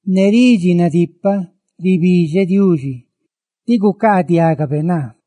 Ne ridxi nadipaꞌ ribidxeꞌ Diuxití gucaadiagabe naa.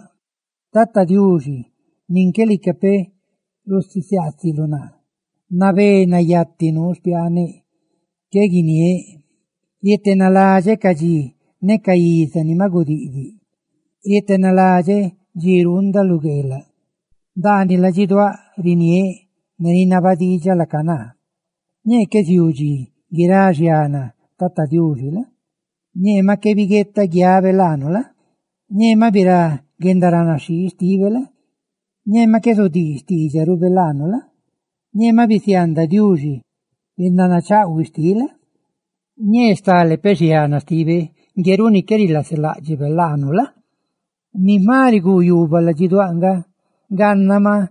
Lii, Tata Diuxi, nin qué lica peꞌ rusisiaasiluꞌ naa; ¡nabé nayati nuu xpiaaneꞌ, ne qué ganda guiniéꞌ! Rietenaladxeꞌ ca dxi ne ca iza ni maꞌ gudiꞌdiꞌ; rietenaladxeꞌ dxi ruundaꞌ lu gueelaꞌ. Ndaaniꞌ ladxiduáꞌ riniéꞌ ne rinaba diidxaꞌ laaca naa: Ñee qué ziuu dxi guirá xiana Tata Diuxi la? Ñee maꞌ qué zabiguetaꞌ guiabe laanu la? Ñee maꞌ birá guendaranaxhii xtibe la? Ñee maꞌ qué zudii xtiidxarube laanu la? Ñee maꞌ bisiaandaꞌ Diuxi guendanachaꞌhuiꞌ xtiꞌ la? Ñee stale peꞌ xiana xtibe ngue runi qué rilaseláꞌdxibe laanu la? Ni jma riguu yuubaꞌ ladxiduáꞌ nga gannaꞌ maꞌ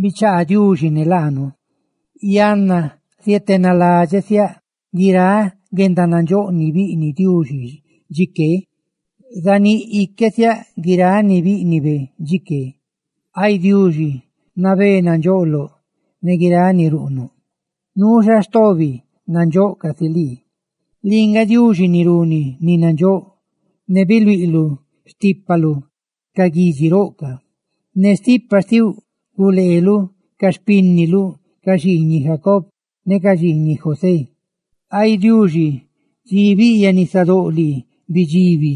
bichaa Diuxi ne laanu. Yanna zietenaladxeꞌ siáꞌ guiráꞌ guendanandxóꞌ ni biꞌniꞌ Diuxi chiqué; zaníꞌ iquesiáꞌ guiráꞌ ni bíꞌnibe chiqué. Ay Diuxi, nabé nandxoꞌloꞌ ne guiráꞌ ni ruꞌnuꞌ; nuu xa stobi nandxóꞌ casi lii. ¡Lii nga Diuxi ni runi ni nandxóꞌ! ¡Biluiꞌluꞌ xtípaluꞌ ca guidxi roꞌ ca! Ne stipa xtiluꞌ guleeluꞌ ca xpínniluꞌ, ca xiiñiꞌ Jacob ne ca xiiñiꞌ José. Ay Diuxi, dxi biꞌyaꞌ nisadóꞌ lii, bidxiibi,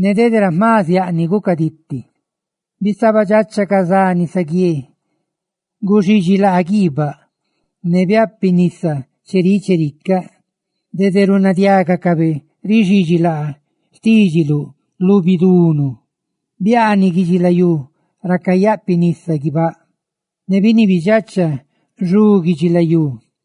ne dede ra jma ziaꞌ ni gucaditi; bisabadxacha ca za nisaguié, guxidxilaa guibáꞌ ne biáꞌpinisa cheríꞌ chericaꞌ. Dede runadiágacabe rixidxi laa xtídxiluꞌ lu bidunu; biaaniꞌ guidxilayú ra cayáꞌpinisa guibáꞌ, ne biniibidxacha xu guidxilayú.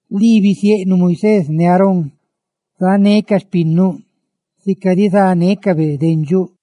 Lii bisieꞌnuꞌ Moisés ne Aarón sánecaꞌ xpinnuꞌ sica rizánecabe dendxuꞌ.